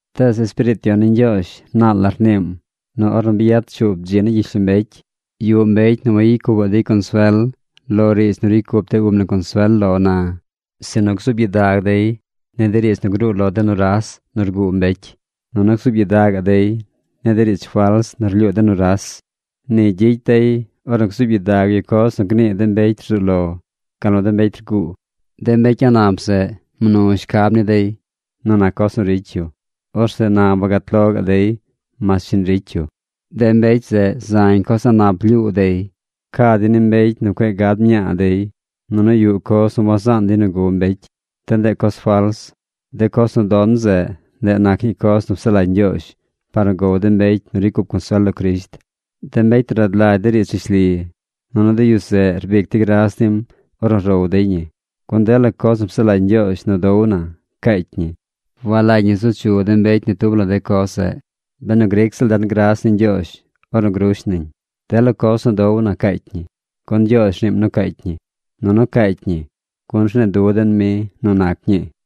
Tees Espiriit Yon ni Ñgyoozh naal la rniim nu ornu bi yad shuub dzi ni gyishlombecy, yuꞌ mbecy nu wayicy cupaꞌ dey consuel lo riidz nu ricy cup de ub na consuel lo na, sinu gzuub gyidag dey ni de riidz nu gruu lo de nuras nu rguu mbecy, nunu gzuub gyidagaꞌ dey ni de riidz fals nu rlyuu de nuras. Ni gyicy dey ornu gzuub gyidag yu coz nu gnii de mbecy rzuu lo, gal nu de mbecy rguu. De mbecy a̱ꞌ nap zeꞌ mnu shcab ni dey nu nac coz nu ricy yu. Orzeꞌ na wagat lo gaꞌ dey mas shiñ ricy yu. De mbecy zeꞌ zañ coz a̱ꞌ nap lyuu dey. Ca dey ni de mbecy nu cueꞌ gad mñaa dey. Nunu yuꞌ coz nu wazaan dey nu gow mbecy. De ndeꞌ coz fals. De coz nu don zeꞌ, ndeꞌ nac ñii coz nu psaꞌ lagy Ñgyoozh par nu gow de mbecy nu ricy cup consuel lo Crisht, de mbecy nu rad lagy de riidz rishli. Nunu de yu zeꞌ rbic dey gras nim ornu row dey ñi. Gun dela coz nu psaꞌ lagy Ñgyoozh nu dow na, caacy ñi. Walagy ñi zu chu mbecy ni tub la de coz zeꞌ benu gric ziꞌl den gras ni Ñgyoozh ornu grush nañ. Dela coz nu dow na caacy ñi, gun Ñgyoozh rniim nu caacy ñi. Nunu caacy ñi gun rnii nu den mi nu nac ñii.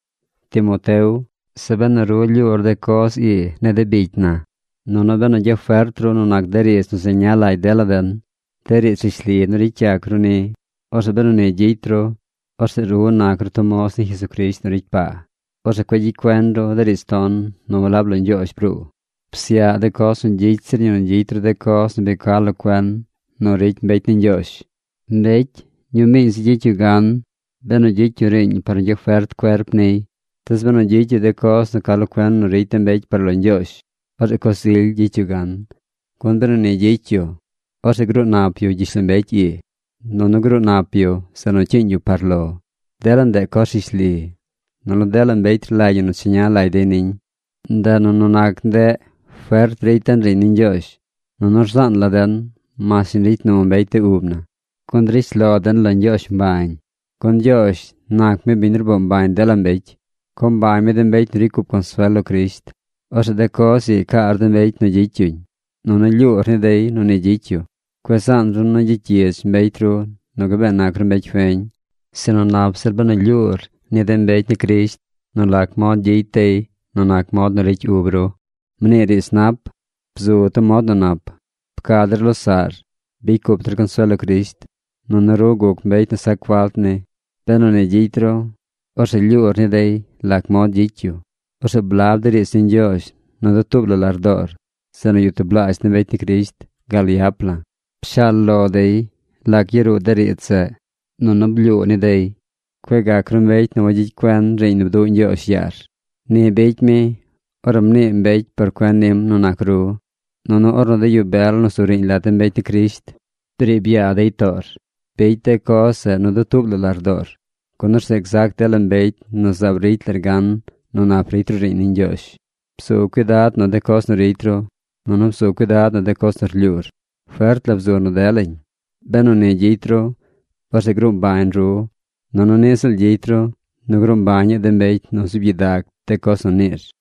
Timoteo, zeꞌ benu ru lyuur de coz ii ni de bicy na, nunu benu gyafert ru nu nac de riidz nu zeña lagy dela den, de riidz rishli nu ricy yac ru ni, orzeꞌ benu ni gyicy ru, orzeꞌ ru nac ru tub moz ni Jesucrisht nu ricy paa. Orzeꞌ cueꞌ gyicy cuen ru de riidz ton nu walab lo Ñgyoozh bruu. Psyaꞌ de coz nu gyicy zir ñi nu gyicy ru de coz nu bi ca lo cuen nu ricy mbecy ni Ñgyoozh. Mbecy ñumiiñ zi gyicy yu gan benu gyicy yu riiñ par nu gyafert cuerp niy. Tees benu gyicy yu de coz nu ca lo cuen nu ricy de mbecy par lo Ñgyoozh, orzeꞌ coz ily gyicy yu gan, gun benu ni gyicy yu, orzeꞌ gruu nap yu gyishlombecy ii, nunu gruu nap yu zeꞌ nu cyiiñ yu par lo. Dela ndeꞌ coz rishli, nunu dela mbecy rlagy ñi nu cheña lagy dey niñ. Ndeꞌ nu nu nac ndeꞌ fert ricy den riiñ ni Ñgyoozh. Nunu rzaan la den mas shiñ ricy nu mbecy de ub na, gun drish lo den lo Ñgyoozh mbañ. Gun Ñgyoozh nac ni biñ nu rboo mbañ dela mbecy. Co mbañ mi de mbecy nu ricy cup consuel lo Crisht. Orzeꞌ de coz ii caar de mbecy nu gyicy yuñ, nunu lyuur ni dey nu ni gyicy yu. Cueꞌ zaan ru nu gyicy gyidz mbecy ru nu gabee nac ru mbecy feñ, sinu nap zir benu rlyuur ni de mbecy ni Crisht nu lac mod gyicy dey nu nac mod nu ricy ub ru. Mnii riidz nap. Bzu tub mod nu nap. Pca de losaꞌr. Bicy cup consuel lo Crisht. Nunu ru guc mbecy nu sac falt ni. Benu ni gyicy ru, orzeꞌ lyuur ni dey lac mod gyicy yu. Orzeꞌ blab de riidz ni Ñgyoozh nu dutuub la lardoor zeꞌ nu yuꞌ tublaazh de mbecy ni Crisht gal yap la̱. Pshaal lo dey lac yaruu de riidz zeꞌ, nunu blyuu ni dey. Cueꞌ gac ru mbecy nu wagyicy cuen riiñ nu bduꞌ Ñgyoozh yaar. Ni bicy mi ornu mnii mbecy por cuen nim nu nac ru, nunu ornu de yu bel nu zu riiñ lat de mbecy ni Crisht briib yaa dey toor. Bicy de coz zeꞌ nu dutuub la lardoor. Gun orzeꞌ gzac dela mbecy nu zaab ricy lar gan nu nap ricy ru riiñ ni Ñgyoozh. Bzu cuidad nu de coz nu ricy ru, nunu bzu cuidad nu de coz nu rlyuur. Fert la bzu nu delañ. Benu ni gyicy ru, orzeꞌ gruu mbañ ru, nunu niꞌ ziꞌl gyicy ru nu gruu mbañaꞌ de mbecy nu zuub gyidag de coz nu niir.